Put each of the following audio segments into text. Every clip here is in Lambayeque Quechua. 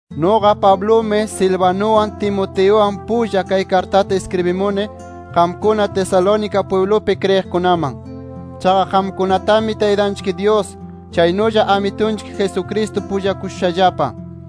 Nuqa Pablumi, Silvanuwan, Timoteuwan pulla, kay kartata iskribimuni qamkuna Tesalónica pwiblupi kriyiqkunaman. Chaqa qamkunatami Taytanchik Dyus, chaynulla Amitunchik Jesucristo pullakushushallapa.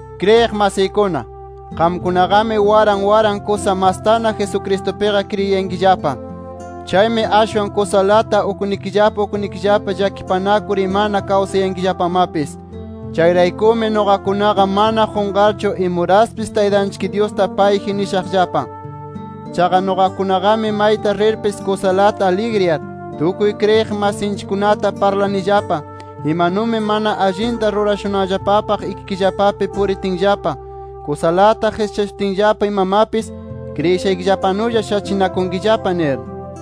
Kriyiq masiykuna, qamkunaqami waran waran kusa mastana Jesucristupiqa kriyiyankillapa. Chaymi ashwan kusalata uknikillapa uknikillapa llakipanakur imana kawsayankillapamapis. Chayraykumi nuqakunaqa mana qunqarchu imuraspis Taytanchik Dyusta payji nishaqllapa. Chaqa nuqakunaqami mayta rirpis kusalata aligriyar, tukuy kriyiq masinchikkunata parlanillapa imanumi mana allinta rurashunanllapapaq ikikillapapi puritinllapa, kusalata qischashutinllapa imamapis, kriyishaykillapanulla shachinakunkillapa nir.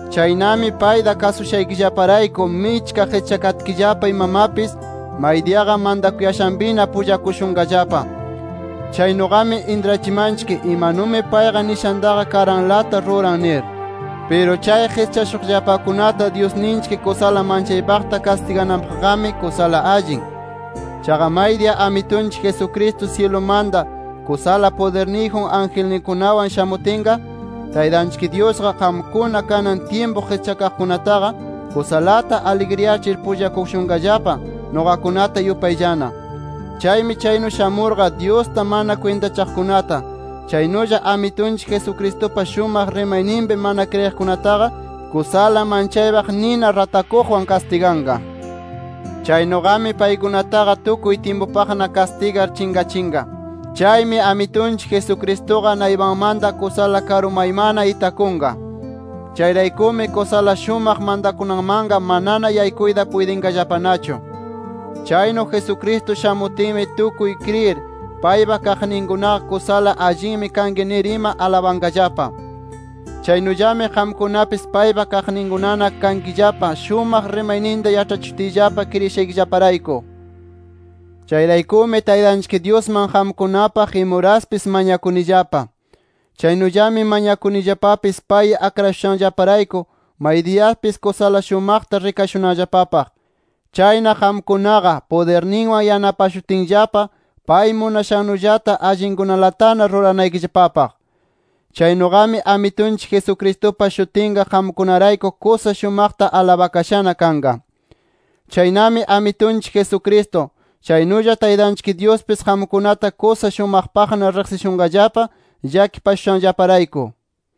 Chaynami payta kasushaykillaparayku michka qischakatkillapa imamapis, maydiyaqa mantakuyashanpina pullakushunqallapa. Chaynuqami intrachimanchik imanumi payqa nishantaqa karanlata ruran nir. Piru chay qischashuqllapakunata Dyusninchik kusala manchaypaqta kastigananpaqqami kusala allin. Chaqa maydiya Amitunchik Jesucristo syilumanta kusala pudirniyjun angelninkunawan shamutinqa, Taytanchik Dyusqa qamkuna kanan tyimpu qischakaqkunataqa, kusalata aligriyachir pullakushunqallapa, nuqakunata yupayllana. Chaymi chaynu shamurqa, Dyusta mana kwintachaqkunata, chaynulla Amitunchik Jesucristupa shumaq rimayninpi mana kriyiqkunataqa kusala manchaypaq nina ratakuqwan kastiganqa. Chaynuqami paykunataqa tukuy tyimpupaqna kastigar chinqachinqa. Chaymi Amitunchik Jesucristuqa naypanmanta kusala karumaymanna itakunqa. Chayraykumi kusala shumaq mantakunanmanqa manana yaykuyta puytinqallapanachu. Chaynu Jesucristo shamutinmi tukuy kriyir, paypa kaqninkunaqa, kusala allinmi kanki nir ima alabanqallapa. Chaynullami qamkunapis paypa kaqninkunana kankillapa shumaq rimayninta yaĉhachishutiyllapa kriyishaykillaparayku. Chayraykumi Taytanchik Dyusman qamkunapaq imuraspis mañakunillapa. Chaynullami mañakunillapapis pay akrashushanllaparayku, maydiyapis kusala shumaqta rikashunanllapapaq. Chayna qamkunaqa, pudirninwan yanapashutinllapa pay munashannullata allinkunalatana ruranaykillapapaq. Chaynuqami Amitunchik Jesucristupa shutinqa qamkunarayku kusa shumaqta alabakashana kanqa. Chaynami Amitunchik Jesucristo, chaynulla Taytanchik Dyuspis qamkunata kusa shumaqpaqna riqsishunqallapa llakipashushanllaparayku.